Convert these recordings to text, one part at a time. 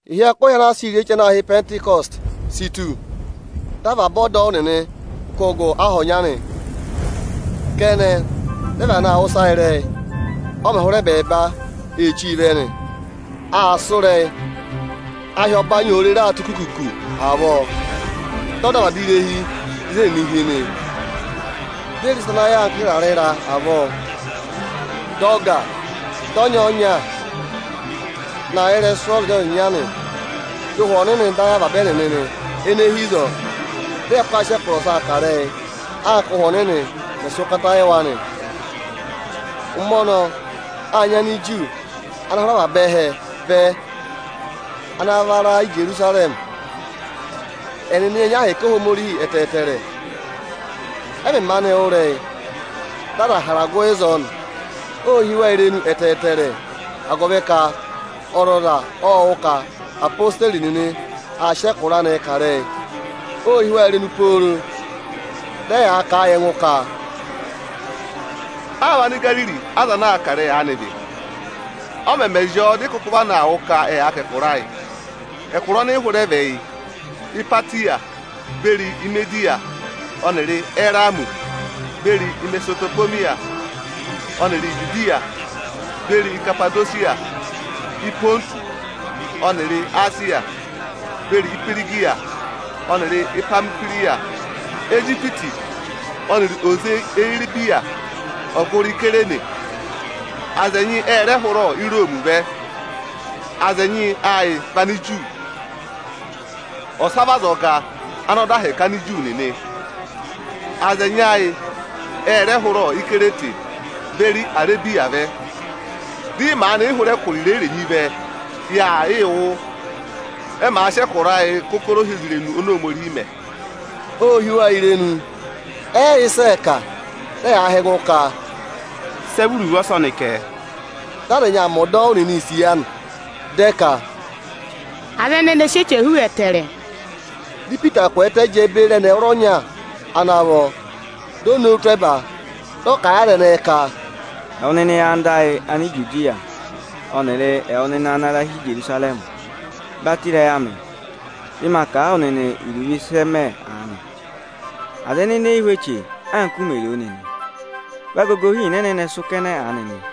Ịhị ẹkụhị ana a sịị̄ rị eche ana aā hị́ Ịpẹntịkọsị si tù, dị avaba ọdọwụ nịnị kụ́ gụ aha ọnya nị. Kẹnẹ, dị ẹ vana aa wụ́ ịsa ịrẹyị, ọ mẹ̀ hụrẹ ẹbẹẹba ee chíi vẹ nị. Aa sụ́ ịrẹyị, ahị ọbanyị òo rere aa tụ́ kuku-kuku avọọ, dị ọ dọ avaba irehi ịzị ẹnịnị hi nị. Di e re ịsa ana yà anka ịrarẹ ịra avọọ, dị ọ gà, dị ọnyọọnya na yà ịrẹsụ ọzịnya-ọzịnya nị. Dị Ụhwẹ Ọnịnị dọ ayị avaba ẹnịnị ene hi ịzọọ, dị ẹ kụkụ aa sị ẹkụra ọsaa kà ịrẹyị, anka Ụ́hwẹ Ọnịnị mẹ̀ sị ụkata yị wa nị. Ụmẹ ọnọọ, â nyị Aniju nịnị ana hụrẹ avaba ẹhẹ vẹ ana va ra Ijerusarẹmị. Ẹnịnị ệ nyị ahẹkẹ Ohomorihi ẹtẹẹtẹrẹ. Ẹ mẹ̀ maanị wụ́ ịrẹyị, dị aza hara gụ ịzọọ nị. Ô hí wa irenu ẹtẹẹtẹrẹ, agụvị ka ọzọza ộ wụ́ ka odeyi nịnị aa sị ẹkụra anịị kà ịrẹyị. Ô hí wa irenu pooro, dị ẹyaa kà a yị ẹngụ ka, “Áa vị Anigariri aza ana aa kà ịrẹyị aanị vị? Ọ mẹ zị ọọ, dị ị kụkụ vana aa wụ́ ka ẹ yaa kà ẹkụra ayị? Ẹkụra ọnị ị hụrẹ vẹ yị: Ipatiya beri Imediya ọnịrị Erami beri Imesopotamiya ọnịrị Ijudiya beri Ikapadosiya; Ịpọntụsị ọnịrị Esiya, beri Ihwirigiya ọnịrị Ipamihwiriya, Ijipiti ọnịrị oze eyi Iribiya ọgụrị Isayirini. Aza ẹnyị ẹ rẹ hụrẹ Iroomi vẹ. Aza ẹnyị ẹ yị vị Aniju, ọsa vị azọga ana dọ ahẹkẹ Aniju nịnị. Aza ẹnyị ayị ẹ rẹ hụrẹ Ikirete beri Arebiya vẹ. Dị ị maanị yị hụrẹ ẹkụra irenyi-irenyi vẹ, ya yị wụ́, ẹ màa sị ẹkụra ayịị kà ụkọrọ ohyozirenu oni Ohomorihi mẹ.” Ô hí wa irenu, ẹ yị yẹ ịsị ẹẹ kà; dị ẹyaa họ̀ ẹngụ ka, “Sị ẹ vị iruvo ọsọnị kẹ?” Dị aza ẹnyị aa mẹ ọdọwụ nịnị isiya nị, dị ẹ ka, “Aza ẹnẹnị ẹ sị eche hú ẹtẹẹrẹ!” Dị Ipita kwẹẹtẹ jẹẹ beri ẹnị ẹwụrọnya ana vọ, di o nowu tụ́ ẹba, dị ọ kà a yị aza ẹnẹẹ ka, “Ẹwụ nịnị anda ayị Anijudiya ọnịrị ẹwụ nịnị ana ra hi Ijerusarẹmị, batọ ịrẹyị amị, dị ma kà a wụ nịnị iruvo ịsị ẹ mẹ aanị. Aza ẹnẹnị e yi hú eche, anka u mè ro o nịnị. Vị agogo ịhịịna ẹnẹnẹ sụ́ kẹnẹ aanị nị.”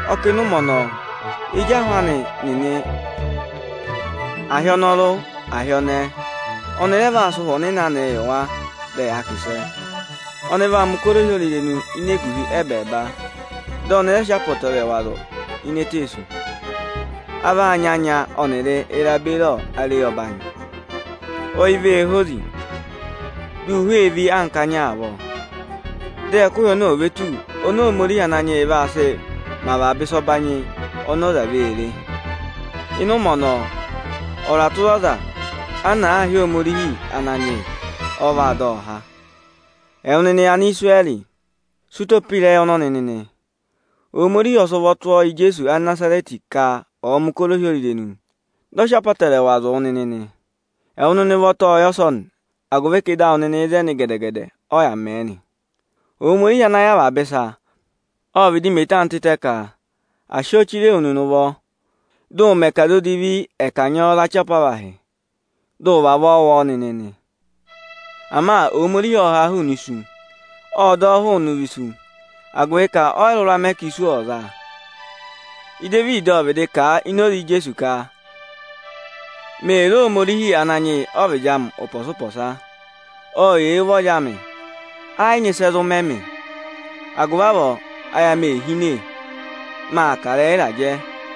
Ọ kà, ịnị ụmẹ ọnọọ, ezi ahụ anị nịnị, a hị́ ọnọrụ a hị́ ọnẹẹ, ọnị rẹ vaa sị Ụhwẹ Ọnịnị anịị yị wa, dị ẹ yaa kà ịsẹ. Ọnị vaa mẹ̀ ụkọrọ ohyozirenu ini eguhi ẹbẹẹba, dị ọnị rẹ sị apọtẹrẹwa zụ̀ ini eteesu: A vaa nyị anya ọnịrị ịra beri areyi ọbanyị. Ọyị vee hozi, dị ụhwẹ ee ví anka anya avọọ, dị ẹkụhị ọnọọ ò ve tù oni Ohomorihi Ananyị yị vaa sị vaa mẹ̀ ịsa ọbanyị ọnị ọza vee re. Ịnị ụmẹ ọnọọ, ọza tụra ọza ana àa hị́ Ohomorihi Ananyị yị, ọ vaa dọ ọ há.” Ẹwụ nịnị Anisirẹrị, sị ụtọ pe ịrẹyị ọnọnị nịnị! Ohomorihi ộ sị ụvọ tụ́ ọọ yị Ijeesu Anịnazarẹtị, ka ọ̀ọ mẹ̀ ụkọrọ ohyozirenu, dị ọ̀ọ sị apọtẹrẹwaa zụ̀ wụ nịnị. Ẹwụ nịnị ụvọta ộ yẹ ọsọnị, agụvị ka ịdị awụ nịnị ịzẹnị gẹdẹ-gẹdẹ ọ yà mẹ̀ ẹ nị. Ohomorihi ana yẹ avaba ịsa, ộ vịdị mẹ eto anị tịtẹ ka à sị ọọ chire wu nịnị ụvọ, dị ụ mẹ ka aza edivi ẹ̀ kanyị ọọ za ọchị apavahị, dị ụ vavọọ wụ ọọ nịnị nị. Ama Ohomorihi ộ ha a hụụnị isu, ộ dọ ọ hụụnị ụvọ isu, agụvị ka ọ yị rụra mẹ ka isu ọ̀ za a. Idevidi ộ vịdị kà a ini oze Ijeesu ka: “Mee re Ohomorihi Ananyị yị ọ́vịdị amị ụpọsa-ụpọsa; ọ yà eyi ụvọrị amị, ẹ yị nyị ịsị ẹ zụ mẹ mị. Agụvị avọọ ayị amị ee hine, maa kà ịrẹyị ịrajẹ.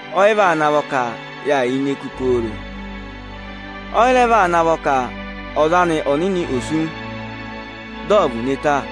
ọ yị vaa navọ ka ma yà ini eku pooro. Ọ yị rẹ vaa navọ ka Ọza ọnịnị anị ò sú, dị ọ̀ vụ̀ ne ta.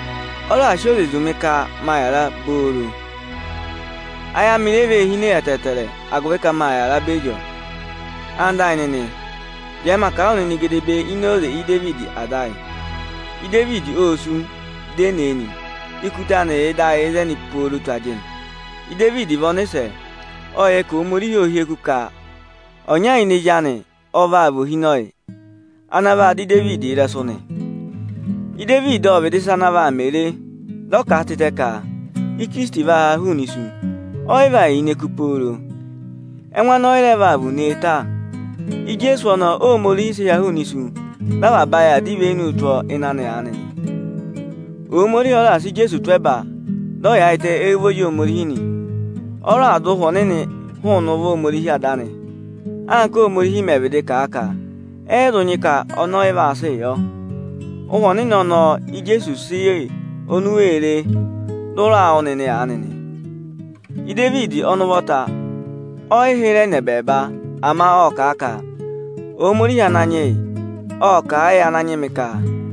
Ọ raà sị oze zụ̀ mị ka maa yàra obooro. Ayị amị re vee hine ẹtẹẹtẹrẹ, agụvị ka mâ yàra beri ọọ.” Ẹwụ nịnị ẹyịnyara amị, jẹẹ ma kà a wụ nịnị gedebee ini oze Idevidi ada ayị. Idevidi ô sú, di e ne e nị. Ikuta anị yà ịdị ayị ịzẹnị pooro tù ajịnị. Ịsa 7.12,13Idevidi vị ọnịsẹ, ộ yẹ ka Ohomorihi ô hyeku ka ọnya ini ezi anị ọ vaa vị ohinọyị ana vaa dọ Idevidi ịrẹsụ nị. Idevidi ộ vịdị sị ịsa ana vaa mẹ re, dị ọ kà a tịtẹ ka Ikirisiti vaa haa hụụnị isu, ọ yị vaa yà ini eku pooro, ẹngụ anị ọ yị rẹ vaa vụ̀ụ ne ta. Ijeesu ọnọọ Óhomorihi sị ha hụụnị isu, dị avaba ayị aa dọ ivenuu tụ́ ịnị anị aanị nị. Ohomorihi ọ raà sị Ijeesu tụ́ ẹba, dị ọ yaayịtẹ éyi ụvọrị Ohomorihi nị. Ọ raà dọ Ụhwẹ Ọnịnị hụụnị ụvọ Ohomorihi Ada anị, anka Óhomorihi mẹ̀ vịdị kà a ka ẹ yị zụ nyị ka ọnị ọ yị vaa sịị yọ. Ụhwẹ Ọnịnị ọnọọ Íjeesu sị yị oni u wee re, dị ụ raa wụ́ nịnị aanị nị. Idevidi ọnị ụvọta ọ yị hịrẹ nọ ẹbẹẹba, ama ộ kà a ka: “Ohomorihi Ananyị yị ộ kà a yị Ananyị mị ka: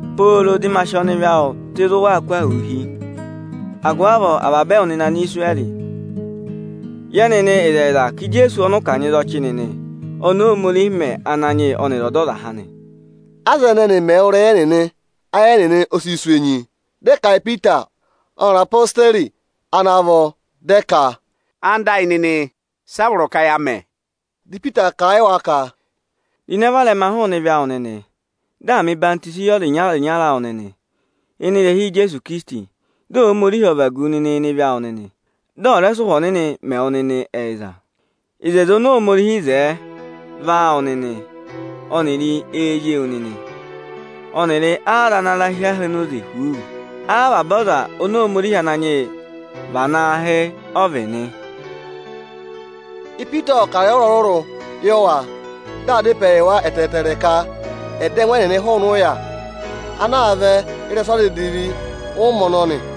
pooro dị ma sị ọnịvị awụ tụ́ ịzị ụ waa kụ́ ahụụ hi.” “Agụvị avọọ ẹwụ nịnị Anisirẹrị, yẹ nịnị ịzẹyịza ka Ijeesu ọnọọ ọnị ụ kanyị za ọchị nịnị, ọnị Óhomorihi mẹ Ananyị yị ọnịrị Ọdọzaha nị!” Aza ẹnẹnị mẹ̀ wụ́ ịrẹyị ẹnẹnị, ayị ẹnịnị ẹ sị sụ̀ enyi. Dị ẹ kà a yị Ipita ọnịrị odeyi nịnị ana vọ, dị ẹ ka, “Ẹwụ nịnị ẹyịnyara amị, sị a vọrọ ka ya mẹ?” Dị Ipita kà a yị wa ka: “Ro ịnẹ, varẹma hụụnị ebira odivi awụ nịnị, dị à mẹ̀ ọyịhwọzenyi yị ọzịnya-ọzịnya awụ nịnị ịnị ịrẹha Ijeesu Ikirisiti, dị Ohomorihi ọ̀ vagu wu ịnị ịvị awụ nịnị, dị ọ̀ rẹ sị Ụhwẹ Ọnịnị mẹ wụ nịnị ẹyịza. Oto oni Ohomorihi wo aanị, vị áawụ nịnị ọnịrị éezi ewu nịnị ọnịrị áaza ana ra hi aha onoze huuu, avaba aza oni Ohomorihi Ananyị yị va naa hị́ ọ vị nị.” Ipita ộ kà ịrẹyị ọrụrụ-ọrụrụ yị wa, dị aa dá ịpẹẹ yị wa ẹtẹẹtẹrẹ, ka ẹ̀ dọ ẹngụ ẹnịnị hụụnị ụya ana aa vẹ ịrẹsụ aza edivi ụmẹ ọnọnị.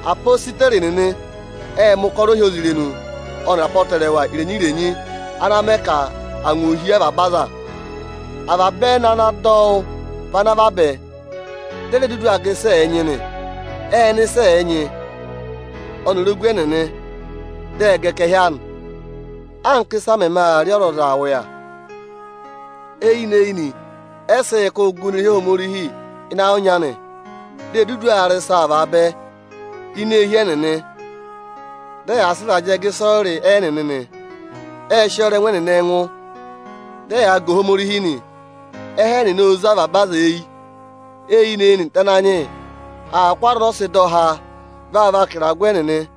Apositeri nịnị ệ mẹ̀ ụkọrọ ohyozirenu ọnịrị apọtẹrẹwa irenyi-irenyi ana mẹ ka angwa o hí avaba aza. Avaba ẹnị ana dọ wụ́ vị ana vabẹ, di e re dudu aa gà ịsị ẹ̀ẹ nyị nị. Ệ ná ịsị ẹ nyị ọnịrị ogu ẹnịnị, dị ẹ gà ẹkẹhị anị, anka ị́sa mẹmẹ aa rị ọzọza ụya nị. Eyinị-eyinị ẹ sịị̄ kụ́ gụ ini irehi Ohomorihi ịnị ayị ọnya nị. Di e dudu aa rị ịsaa vaabẹ ini eehi ẹnịnị, dị ẹyaa sị ịrajẹẹ gà ịsọyịrị ẹnịnị nị. Ệ sị ọọ rọ ẹngụ ẹnịnị ẹngụ. Dị ẹyaa ga Ohomorihi nị; ẹhẹ ẹnịnị ô zé avaba aza eyi. Eyinị-eyinị, dị Ananyị yị aa kụ́ aza ọnị ọ sị dọ há vaa vaka ịragụ ẹnịnị.